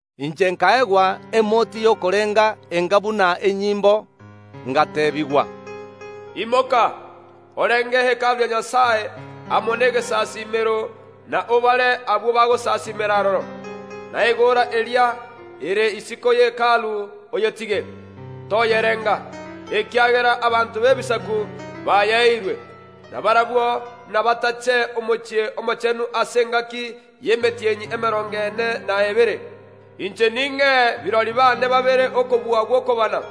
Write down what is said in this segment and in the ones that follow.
Inche nkaegwa emoti y’okorenga enga buna enyimbo, ngateebigwa, “Imoka, orenge Hekalu ya Nyasae amo negesasiimero na obare abwo bagosasiimera aroro. Na egoora eria ere isiko ye Hekalu oyetige, toyerenga, ekiagera abanto b’ebisaku bayeeirwe, na barabwo nabatache omochie omochenu ase engaki y’emetienyi emerongo ene na ebere. Inche ning’ee birori baane babere okobua gw’okobana,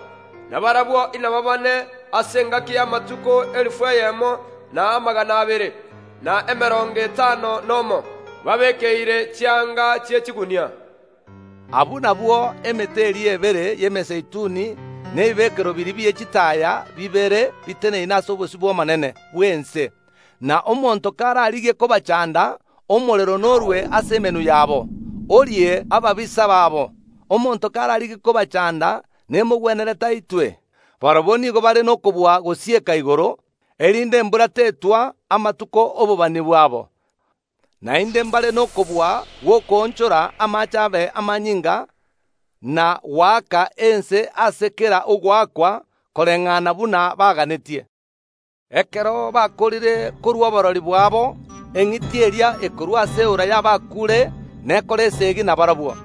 na barabwo inababane ase engaki y’amatuko elifu eyemo na amagana abere, na emerongo etano nomo, babeekeire chianga chi’echigunia.” Abwo nabwo emete eria ebere y’emezeituni na ebibekerero biria bie chitaaya bibere biteneine ase obosio bw’Omonene bw’ense. Na omonto kararigie kobachanda, omorero norue ase emenwa yabo, orie ababisa babo. Omonto kararigie kobachanda, nemogwenerete aitwe. Barabwo nigo bare nokobua gosieka igoro, erinde embura tetwa amatuko ’obobani bwabo, naende mbare nokobua gw’okoonchora amaache abe amanyinga, na goaka ense ase kera ogoakwa, koreng’ana buna baganetie. Ekero bakoorire korua oborori bwabo eng’iti eria ekorwa ase eora y’abakuure nekore esegi na barabwo.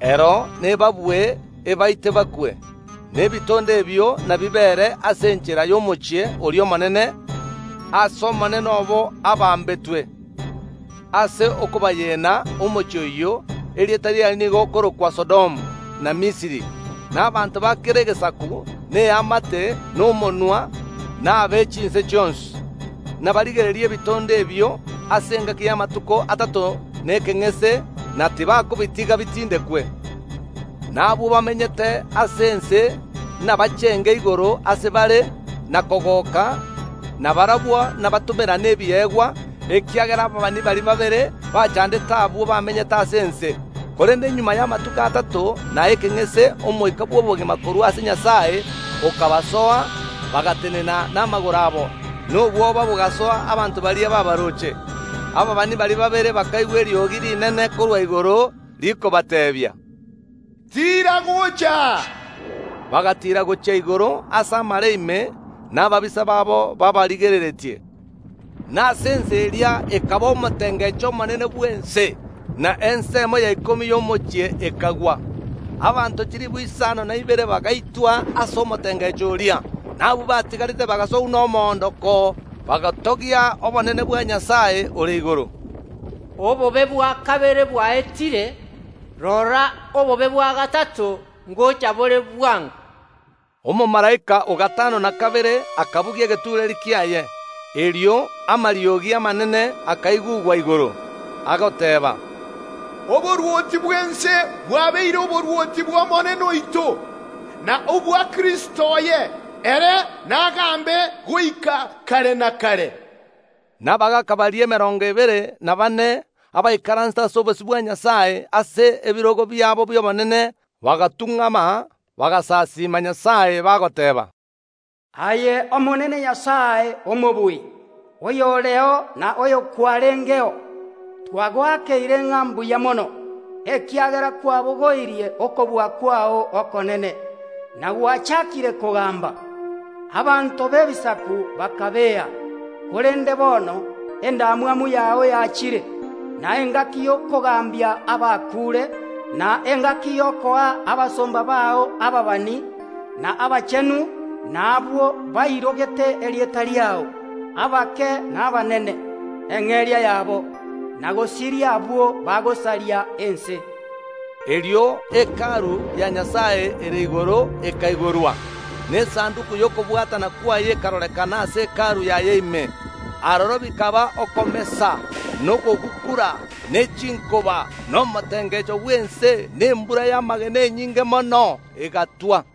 Ero nebabue, ebaite bakwe, na ebitondo ebio nabibeere ase enchera y’omochie oria omonene aase Omonene obo abambetwe. Ase okobayena omochie oyio erieta riaye nigo okorokwa Sodomu na Misiri. Na abanto ba kera egesaku, na eamate, na omonwa, na abe chinse chionsi, nabarigererie ebitondo ebio ase engaki y’amatuko atato na ekeng’ese, na tibakobitiga bitindekwe. Na abwo bamenyete ase ense nabachenge igoro ase bare na kogoka, na barabwo nabatomerane ebiegwa, ekiagera ababani baria babere bachandete abwo bamenyete ase ense. Korende magega y’amatuko atato na ekeng’ese omoika bw’obogima korwa ase Nyasae okabasoa, bagatenena namagoro abo, na obwoba bogasoa abanto baria baabaroche. Abaabani baria babere bakaigwa eriogi rinene korwa igoro rikobateebia, “Tiira gocha aa!” Bagatiira gochia igoro ase amare ime, na ababisa babo baabarigereretie. Na ase ensa eria ekaba omotengecho omonene bw’ense, na ensemo ya ikomi y’omochie ekagwa. Abanto chilifu isano na ibere bagaitwa ase omotengecho oria, na abwo batigarete bagasogwa nomoondoko, bagatogia obonene bwa Nyasae ore igoro. Obobe bwa kabere bwaetire, rora, obobe bwa gatato ngocha bore bwango. Omomalaika o gatano na kabere akabugia egetureeri kiaye. Erio amariogi amanene akaigugwa igoro, agoteeba, “Oborwoti bw’ense bwabeire oborwoti bw’Omonene oito, na obwa Kristo oye, ere nagambe goika kare na kare.” Na abagaaka baria emerongo ebere na baane, abaikaransete ase obosio bwa Nyasae ase ebirogo biabo bi’obonene, bagatung’ama, bagasasiima Nyasae, bagoteeba, “Aye Omonene Nyasae Omobui, oyoreo na oyokwarengeo, twagoakeire ng’a mbuya mono, ekiagera kwabogoirie okobua kwao okonene, na gwachakire kogamba. Abanto b’ebisaku bakabea, korende bono endamwamu yao yachire, na engaki y’okogambia abakuure, na engaki y’okoa abasomba bao ababani, na abachenu, na abwo bairogete erieta riao, abake na abanene, eng’eria yabo, na gosiria abwo bagosaria ense.” Erio Hekalu ya Nyasae ere igoro ekaigorwa, na Esanduki y’okobwatana kwaye ekarorekana ase Hekalu yaye ime. Aroro bikaba okomesa, na okogukura, ne chinkoba, na omotengecho bw’ense, na embura y’amagena enyinge mono egatwa.